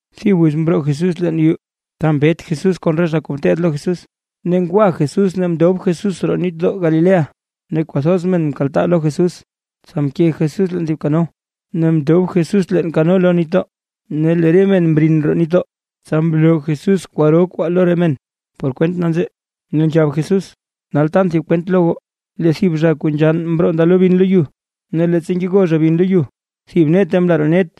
Thib wiz mroo Jesús leen yuu ta mbet Jesús kon re zha kuu ngeteed lo Jesús, ne ngwa Jesús mndob Jesús roo nitdoo Galilea. Ne kwathoz men mkaltaa lo Jesús, tsa mke Jesús leen thib kano ne mndob Jesús leen kano lo nitdoo. Ne lee re men mrin roo nitdoo. Tsa mloo Jesús kwaro kwaa lo re men por kwent nanzee. Ne nzhab Jesús: ―Nal tan thib kwent lo goo, lee thib zha kuu nzhann mroo ndalo bin lo yu. Ne leettsa ngego zha bin lo yu, thib nete mla roo net,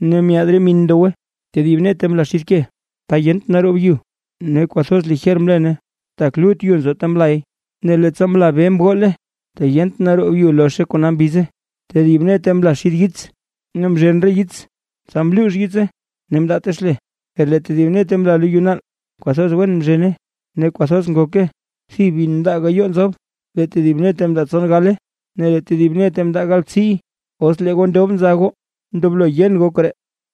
ne myaad re min ndowe. Tedib nete mla xid ke, ta yent naroob yu; ne kwathoz lijer mlene, tak lut yu nzo ta mlay. Ne leettsa mla be mgole, tak yent naroob yu lozhe kona mbize. Tedib nete mla xid yits, ne mzhen re yits tsa mluux yitse ne mndaate xle. Per lee tedib nete mla lo yu naal, kwathoz wen mzhene ne kwathoz ngoke. Thib bin mndaa gayoo nzob, lee tedib nete mndaa tson gale ne lee tedib nete mndaa galbtsiiy. ¡Os lee goo ndob nza goo ndoblo yen goo koree!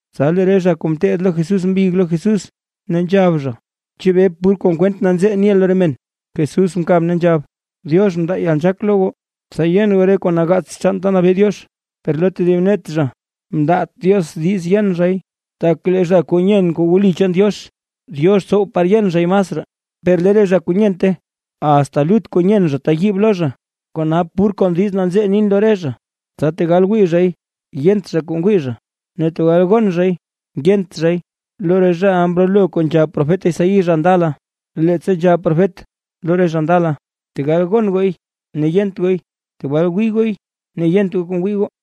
Tsa lee re zha kuu ngeteed lo Jesús mbig lo Jesús, ne nzhab zha: ―¿Chebee pur kon kwent nanzee niʼa lo re men? Jesús mkab ne nzhab: ―Diox mndaa yalnzhaak lo goo, tsa yen goo re kuu nagaats chaan ta nabee Diox; per lo tedib net zha mndaat Diox diiz yen zhay. Tak lee zha kuu nyen kuu wli chaan Diox, Diox tsow tsa yen zhay masraa; per lee re zha kuu nyente, asta lut kuu nyen zha teyiibe lo zha. Kona pur kon diiz nanzee nin lo re zha, tsa tegal wii zhay yent zha kuu ngwii zha, ne tegal gon zhay yent zhay. Lo re zhaʼa mrolo kuu nzhab profet Isaí zha ndala, leettsa nzhab profet lo re zha ndala: Tegal gon gooy ne yent gooy, tegal wii gooy ne yent goo kuu ngwii goo.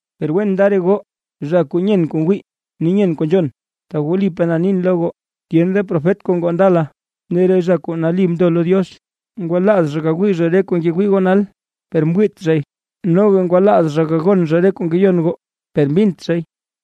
’Per wen nda re goo zha kuu nyen kuu ngwii ne nyen kuu nzhon. Tak wlipaa na nin lo goo, tyen re profet kuu ngoo ndala, ne re zha kuu nali mndo lo Diox, ngwalaaz zha gawii zha re kuu ngewii goo nal, per mwiit zhay; noga ngwalaaz zha gagon zha re kuu ngeyon goo, per mbint zhay.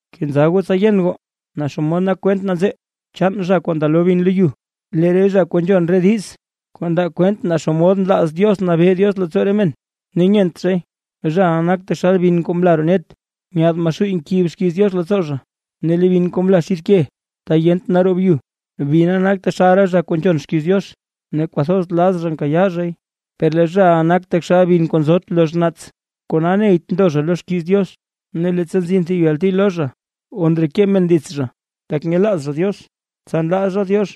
’Kenza goo tsa yen goo naa xomod nak kwent nanzee chaan zha kuu ndalo bin lo yu. Lee re zha kuu nzhon re diiz, kuu ndaa kwent naa xomod nlaaz Diox nabee Diox leettsoo re men, ne nyent zhay, zhaʼa nak taxal bin kuu mla roo net. Nyaad Maxuuy nkib xkiiz Diox leettsoo zha. Ne lee bin kuu mla xid ke ta yent naroob yu, bina nak taxal re zha kuu nzhon xkiiz Diox, ne kwathoz laz zha nkayaa zhay. Per lee zhaʼa nak taxal bin kuu nzot lozh naats, kona neyt ndo zha lo xkiiz Diox. Ne leettsa nzin thib yalti lo zha o ndreke men dits zha, tak nyelaaz zha Diox, tsa nlaa zha Diox.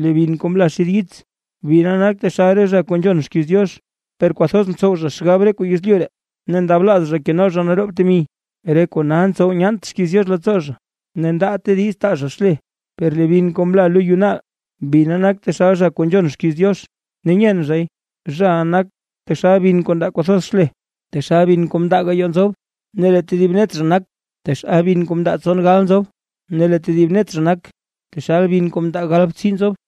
Lee bin kuu mla xid yits, bina nak taxal re zha kuu nzhon xkiiz Diox, per kwathoz ntsow zha xgab re kuu yezlyu ree, ne ndablaaz zha keno zha naroob temi. Re kona ntsow nyaant xkiiz Diox leettsoo zha, ne ndaate diiz taa zha xle. Per lee bin kuu mla lo yu naal, bina nak zha kuu nzhon xkiiz Diox ne nyen zhay. Zhaʼa nak taxal bin kuu ndaa kwathoz xle. Taxal bin kuu mndaa gayoo nzob, lee tedib net zha nak taxal bin kuu mndaa tsongal nzob, ne lee tedib net zha nak taxal bin kuu mndaa galbtsii nzob.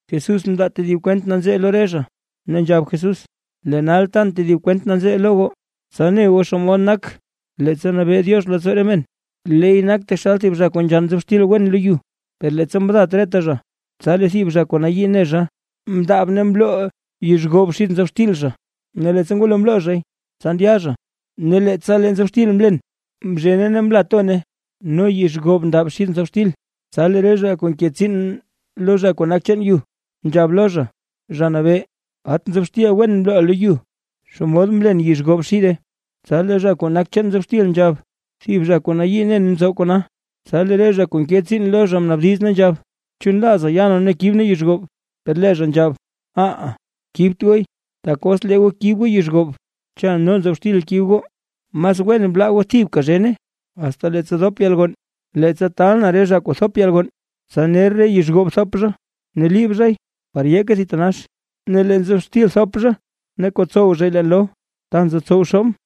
Jesús mndaa tedib kwent nanzee lo re zha, ne nzhab Jesús: ―Lee nal tan tedib kwent nanzee lo goo. Tsa ne goo xomod nak leettsa nabee Diox leettsoo re men. Leey nak taxal thib zha kuu nzhann nzob xtil wen lo yu. Per leettsa mdat reta zha, tsa lee thib zha kuu nayii ne zha, mndaab ne mloo yizh goob xid nzob xtil zha. Ne leettsa ngwalo mloo zhay, tsa ndya zha. Ne leettsa lee nzob xtil mlen, mzhene ne mla tone, no yizh goob ndab xid nzob xtil. Tsa lee re zha kuu nke tsiin lo zha kuu nak chaan yu, nzhab lo zha: “Zha Nabee, ¡at nzob xtil wen mloʼaa lo yu! ¿Xomod mlen yizh goob xide?” Tsa lee zha kuu nak chaan nzob xtil nzhab: “Thib zha kuu nayii nen mtsow kona”. Tsa lee re zha kuu nke tsiin lo zha mnaabdiz ne nzhab: “¿Chu nlaaza ya nee ne kib nee yizh goob?” Per lee zha nzhab: “Aha, kibt gooy. Tak os lee goo kib goo yizh goob, cha noga nzob xtil kib goo. Mas wen blaa goo thibka zhene, asta leettsa dop yalgonn. Leettsa taalʼn re zha kuu thop yalgonn, tsa ner re yizh goob thop zha ne liib zhay par yeeke thitanax. Ne lee nzob xtil thop zha ne kotsow zha leen loo ta nzotsow xoobʼn.”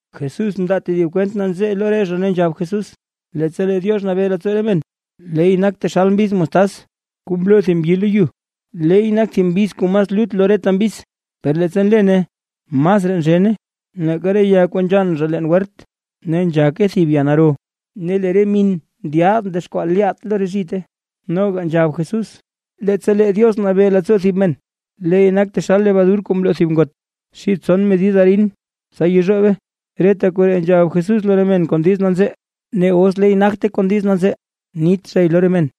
Jesús mndaa tedib kwent nanzee lo re zha, ne nzhab Jesús: ―Leettsa lee Diox nabee leettsoo re men, leey nak taxal thib mbiz mostaz kuu mloo thib mbyi lo yu. Leey nak thib mbiz kuu mas lut lo reta mbiz, per leettsa nlene masraa nzhene nake re ya kuu nzhann zha leen wert. Ne nzhake thib ya naro ne lee re min ndyaad ndexkwaa lyaat lo re zhite. Noga nzhab Jesús: ―Leettsa lee Diox nabee leettsoo thib men, leey nak taxal lebadur kuu mloo thib ngot xid tson medid arin tsa yezhoobe. Reta koree nzhab Jesús lo re men kon diiz nanzee, ne os leey nagte kon diiz nanzee nit zhay lo re men.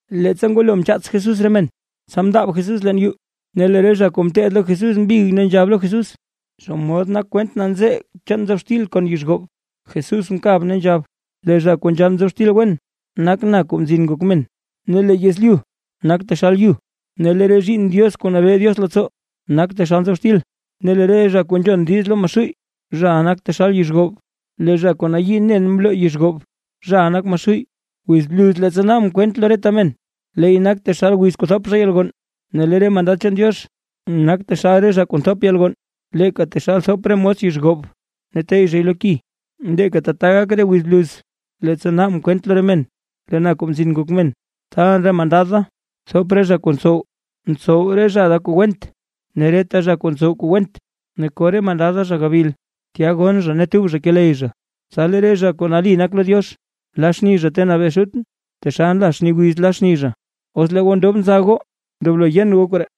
Leettsa ngwalo mchaats Jesús re men, tsa mndaab Jesús leen yuu, ne lee re zha kuu ngeteed lo Jesús mbig ne nzhab lo Jesús: ―¿Xomod nak kwent nanzee chaan nzob xtil kon yizh goob? Jesús mkab ne nzhab: ―Lee zha kuu nzhann nzob xtil wen, nak na Kuu Mzin Ngok Men. Ne lee yezlyu nak taxal yu, ne lee re zhiinn Diox kuu nabee Diox leettsoo, nak taxal nzob xtil, ne lee re zha kuu nzhon diiz lo Maxuuy, zhaʼa nak taxal yizh goob. Lee zha kuu nayii nen mloo yizh goob, zhaʼa nak Maxuuy. Wiz bluz leettsa naabʼn kwent lo reta men, leey nak taxal wiz kuu thop zha yalgonn, ne lee re mandad chaan Diox, nak taxal re zha kuu thop yalgonn. Leeka taxal nthop re mos yizh goob ne nteyy zhay lo ki, leeka tata gak wiz bluz leettsa naabʼn kwent lo re men. Lee na Kuu Mzin Ngok Men, taalʼn re mandad da thop re zha kuu ntsow, ntsow re zha da kuu went, ne reta zha kuu ntsow kuu went. Ne ko re mandad da zha gabil. Tya gonn zha ne tub zha keley. Tsa lee re zha kuu nali nak lo Diox la xni zha ta nabee Xutʼn, taxal nla xni wiz la xni zha. ¡Os lee goo ndob nza goo ndoblo yen goo koree!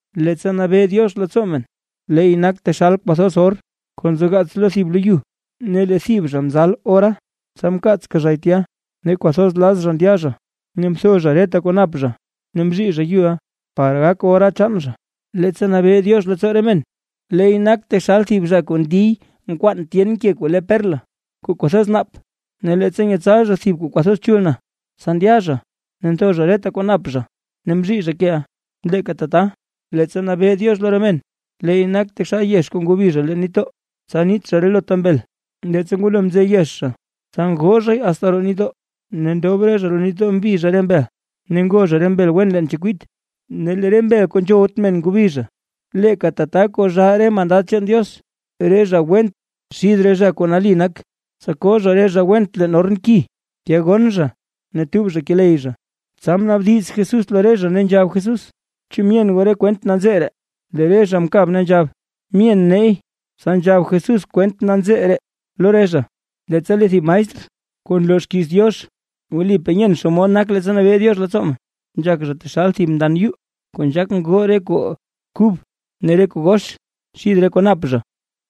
’Leettsa nabee Diox leettsoo men, leey nak taxal kwathoz or kuu nzogaats lo thib lo yu. Ne lee thib zha mzal ora, tsa mkaatska zhay tya. Ne kwathoz laz zha ndya zha ne mtho zha reta kuu nap zha, ne mzhii zha yuʼa, par gak ora chaan zha. ’Leettsa nabee Diox leettsoo re men, leey nak taxal thib zha kuu ndiy nkwaan tyen ke kuu le perla kuu kwathoz nap. Ne leettsa nyetsal zha thib kuu kwathoz chul na, tsa ndya zha ne mtho zha reta kwaa nap zha, ne mzhii zha keʼa. ’Leeka tata, leettsa nabee Diox lo re men, leey nak taxal yex kuu ngobi zha leen nitdoo, tsa niit zha relota mbel. Leettsa ngwalo mze yex zha, tsa ngoo zhay asta roo nitdoo, ne ndob re zha roo nitdoo mbi zha re mbel. Ne ngo zha re mbel wen leen chekwit ne lee re mbel kuu nzhowt men ngobi zha. Leeka tata kozhaa re mandad chaan Diox re zha went xid re zha kuu nali nak. Tsa ko zha re zha went leen orn ki, tya gonn zha ne tub zha keley zha. Tsa mnaabdiz Jesús lo re zha, ne nzhab Jesús: ―¿Chu myen goo re kwent nanzee ree? Lee re zha mkab ne nzhab: ―Myen neey. Tsa nzhab Jesús kwent nanzee ree lo re zha ne nzhab Jesús: ―Leettsa lee thib maestr, kuu nloo xkiiz Diox, wlipaa nyen xomod nak leettsa nabee Diox leettsoo men, nzhak zha taxal thib mndan yuu, kuu nzhaak ngoo re kuu kub ne re kuu gox xid re kuu nap zha.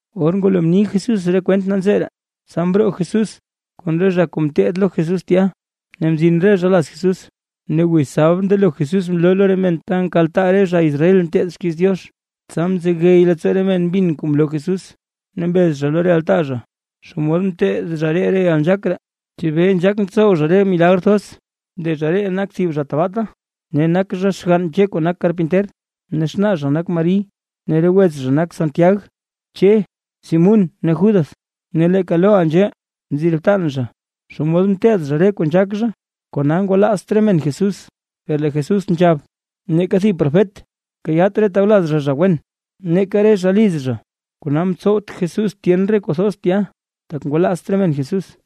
Or ngwalo mni Jesús re kwent nanzee ree, tsa mroo Jesús kon re zha kuu ngeteed lo Jesús tya, ne mzin re zha laz Jesús. Ne wiz sabd mndelo Jesús mloo lo re men ta nkaltaa re zha Israel nteed xkiiz Diox. Tsa mzegey leettsoo re men mbin kuu mloo Jesús, ne mbez zha lo re altaa zha: ―¿Xomod mteed zha ree yalnzhaak ree? ¿Chebee nzhaak ntsow zha re milagr thoz? ¡Lee zha ree nak thib zha tbaata, ne nak zha xgann Che kuu nak karpinter ne xnaa zha nak Mari, ne re wets zha nak: Santiag, Che, Simún ne Judas! Ne leeka loʼaa nzhee nzi re btan zha. ¿Xomod mteed zha re kuu nzhaak zha? Kona ngwalaazt re men Jesús. Per lee Jesús nzhab: ―Neeka thib profet nkayaat re tawlaz zha zha wen ne neeka re zha liz zha. Kona mtsowt Jesús tyen re kuu thoz tya, tak ngwalaazt re men Jesús.